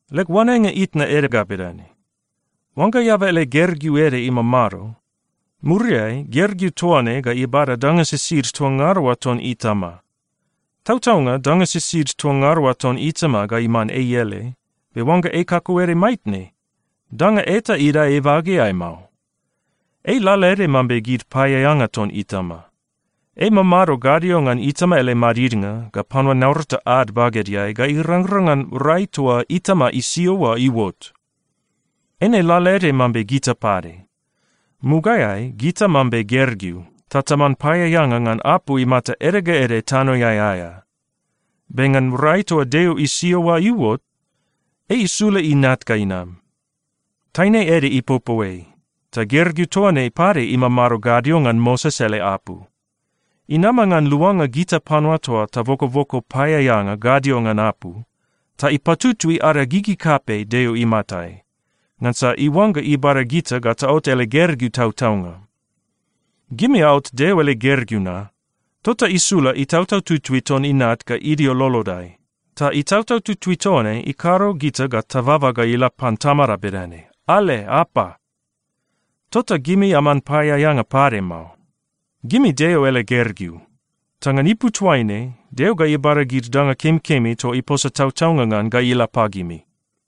Leg oanenga itna ede ga bedane: Oangga eaba ele gergeu ede imamado, muriai gergeu toa ne ga ibada danga sisid toa ngada oa ton itama. Tautaunga, danga sisid toa ngada oa ton itama ga iman ei ele, be oangga ei kakauede maitne, danga eta idae ibageai mao. Ei lalaede mambe gid paeaeanga ton itama. Ei imamado gadio ngan itama ele madidnga ga panua naurata ad bagedeai ga irangrang ngan rai toa itama isio oa iuot. Eine lalaede mambe gita pade. Mugaeai gita mambe gergeu, ta taman paeaeanga ngan apu imata ede ga ede tanoeai aea. Be ngan rai toa Deo isio oa iuot, ei isula Inat ga inam. Taine ede ipopo ei, ta gergeu toa ne pade imamado gadio ngan Moses ele apu. Inama ngan luanga gita panua toa tabokoboko paeaeanga gadio ngan apu, ta ipatutui ada gigi kapei Deo imatai, ngansa iuangga ibada gita ga taot ele gergeu tautaunga. Gimi aot Deo ele gergeu na, tota isula Itautau Tutui ton Inat ga idio lolodai, ta Itautau Tutui toa ne ikado gita ga tababa ga ila pan Tamada bedane, “Ale apa!” Tota gimi aman paeaeanga pade mao. Gimi Deo ele gergeu. Ta ngan ipu toaine, Deo ga ibada gid danga kemikemi toa iposa tautaunga ngan ga ila pagimi.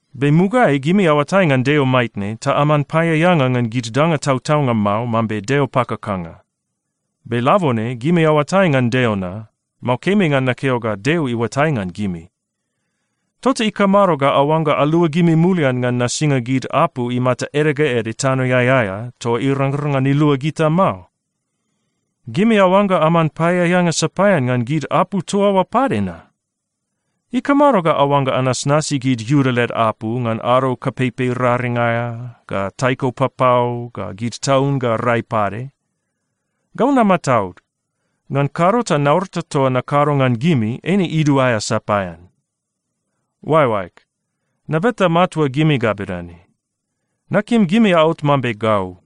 Be mugaeai gimi aoatai ngan Deo maitne ta aman paeaeanga ngan gid danga tautaunga mao mambe deo pakakanga. Be labone gimi aoatai ngan Deo na (mao kemi ngan nakeo ga Deo iuatai ngan gimi), tota ikamado ga aoangga aluagimi mulian ngan nasinga gid apu imata ede ga ede tanoeai aea toa irangrang ngan ilua gita mao? Gimi aoangga aman paeaeanga sapaean ngan gid apu toa oa pade na? Ikamado ga aoangga anasnasi gid Iuda led apu ngan ado kapeipei raring aea, ga taiko papau, ga gid taun ga rai pade? Gau namataud. Ngan kado ta naurata toa nakado ngan gimi, eine iduaea sapaean. Oaeoaeg, nabeta matua gimi ga bedane: Nakim gimi aot mambe gau.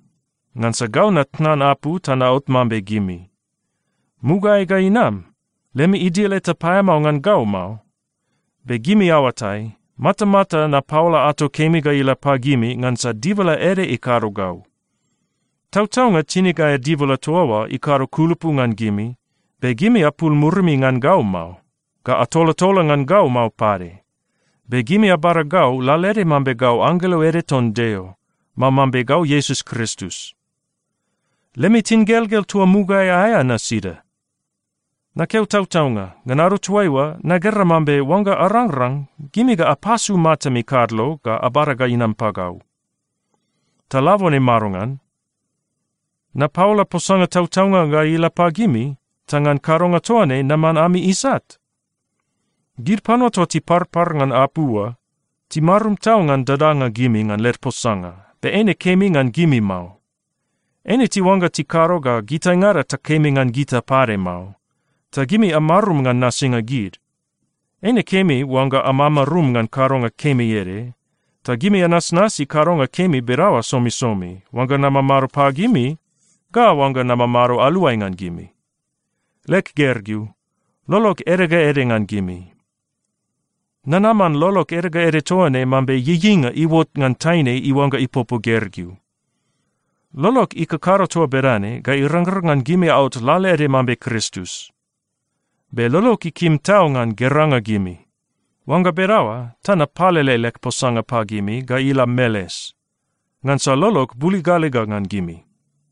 Ngansa gau natnan apu ta naot mambe gimi. Mugaeai ga inam, lemi idil eta paeamao ngan gau mao. Be gimi aoatai, matamata napaola ato kemi ga ila pagimi ngansa dibala ede ikado gau. Tautaunga, tinig aea dibala toa oa ikado kulupu ngan gimi, be gimi apul murimi ngan gau mao, ga atolatola ngan gau mao pade. Be gimi abada gau lalaede mambe gau anggelo ede ton Deo, mao mambe gau Iesus Kristus. Lemi tingelgel toa mugaeai aea na sida? Nakeo tautaunga, ngan ado toaiua, nagera mambe oangga arangrang, gimi ga apasu matami kadlo ga abada ga inam pagau. Ta labone madongan? Napaola posanga tautaunga ga ila pagimi, ta ngan kadonga toa ne naman ami isat? Gid panua toa tiparpar ngan apu oa, timarum tau ngan dadanga gimi ngan led posanga, be eine kemi ngan gimi mao. Eine tiuangga tikado ga gitaingada takemi ngan gita pade mao, ta gimi amarum ngan nasinga gid. Eine kemi oangga amamarum ngan kadonga kemi ede. Ta gimi anasnasi kadonga kemi bedaoa somisomi, oangga namamado pagimi, ga oangga namamado aluai ngan gimi. Leg gergeu, lolog ede ga ede ngan gimi. Nanaman lolog ede ga ede toa ne mambe ieieinga iuot ngan taine iuangga ipopo gergeu. Lolog ikakado toa bedane ga irangrang ngan gimi aot lalaede mambe Kristus. Be lolog ikim tau ngan geranga gimi. Oangga bedaoa ta napalele leg posanga pagimi ga ila meles. Ngansa lolog buligaliga ngan gimi.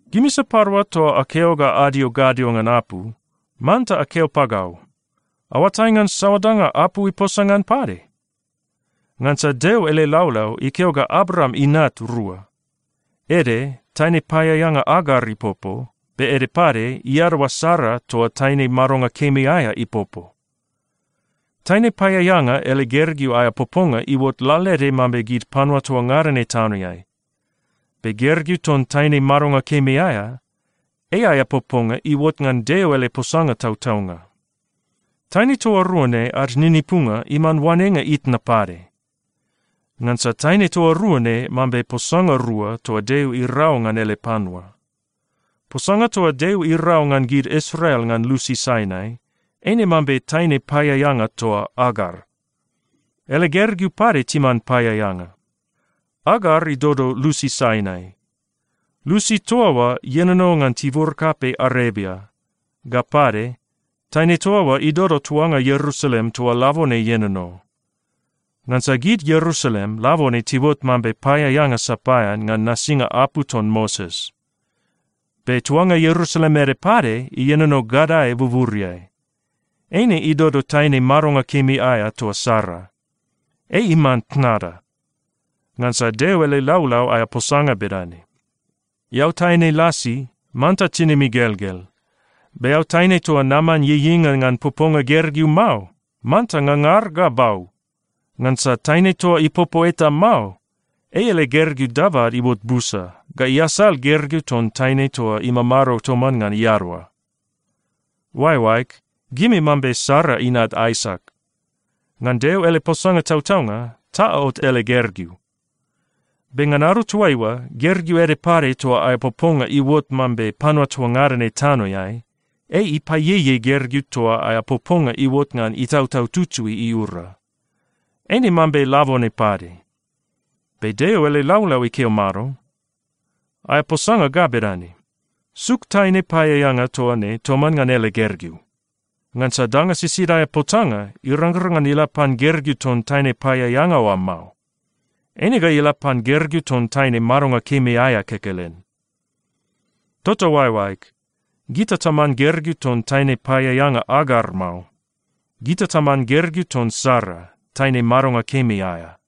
Gimi sapadua toa akeo ga adio gadio ngan apu, manta akeo pagau, aoatai ngan saoa danga apu iposa ngan pade? Ngansa Deo ele laulau ikeo ga Abraam inat rua. Ede, taine paeaeanga Agar ipopo, be ede pade, iadaoa Sara toa taine madonga kemi aea ipopo. Taine paeaeanga ele gergeu aea poponga iuot lalaede mambe gid panua toa ngada ne tanoeai. Be gergeu ton taine madonga kemi aea, ei aea poponga iuot ngan Deo ele posanga tautaunga. Taine toa rua ne ad ninipunga iman oanenga itna pade. Ngansa taine toa rua ne mambe posanga rua toa Deo irau ngan ele panua. Posanga toa Deo irau ngan gid Israel ngan lusi Sainai, eine mambe taine paeaeanga toa Agar. Ele gergeu pade timan paeaeanga. Agar idodo lusi Sainai. Lusi toa oa ienono ngan tibur kapei Arebia. Ga pade, taine toa oa idodo tuanga Ierusalem toa labone ienono. Ngansa gid Ierusalem, labone tiuot mambe paeaeanga sapaean ngan nasinga apu ton Moses. Be tuanga Ierusalem ede pade ienono gadae buburiai. Eine idodo taine madonga kemi aea toa Sara. Ei iman tnada. Ngansa Deo ele laulau aea posanga bedane, “Eao taine lasi, manta tinim igelgel. Be eao taine toa naman ieieinga ngan poponga gergeu mao, manta ngangar ga bau. Ngansa taine toa ipopo eta mao, ei ele gergeu dabad iuot busa ga iasal gergeu ton taine toa imamado toman ngan iadaoa.” Oaeoaeg, gimi mambe Sara inat Aisak. Ngan Deo ele posanga tautaunga ta aot ele gergeu. Be ngan ado toaiua, gergeu ede pade toa aea poponga iuot mambe panua toa ngada ne tanoeai, ei ipaieiei gergeu toa aea poponga iuot ngan Itautau Tutui iura. Eine mambe labone pade. Be Deo ele laulau ikeo mado? Aea posanga ga bedane, “Suk taine paeaeanga toa ne toman ngan ele gergeu! Ngansa danga sisid aea potanga irangrang ngan ila pan gergeu ton taine paeaeanga oa mao. Eine ga ila pan gergeu ton taine madonga kemi aea kekelen.” Tota oaeoaeg, gita taman gergeu ton taine paeaeanga Agar mao. Gita taman gergeu ton Sara, taine madonga kemi aea.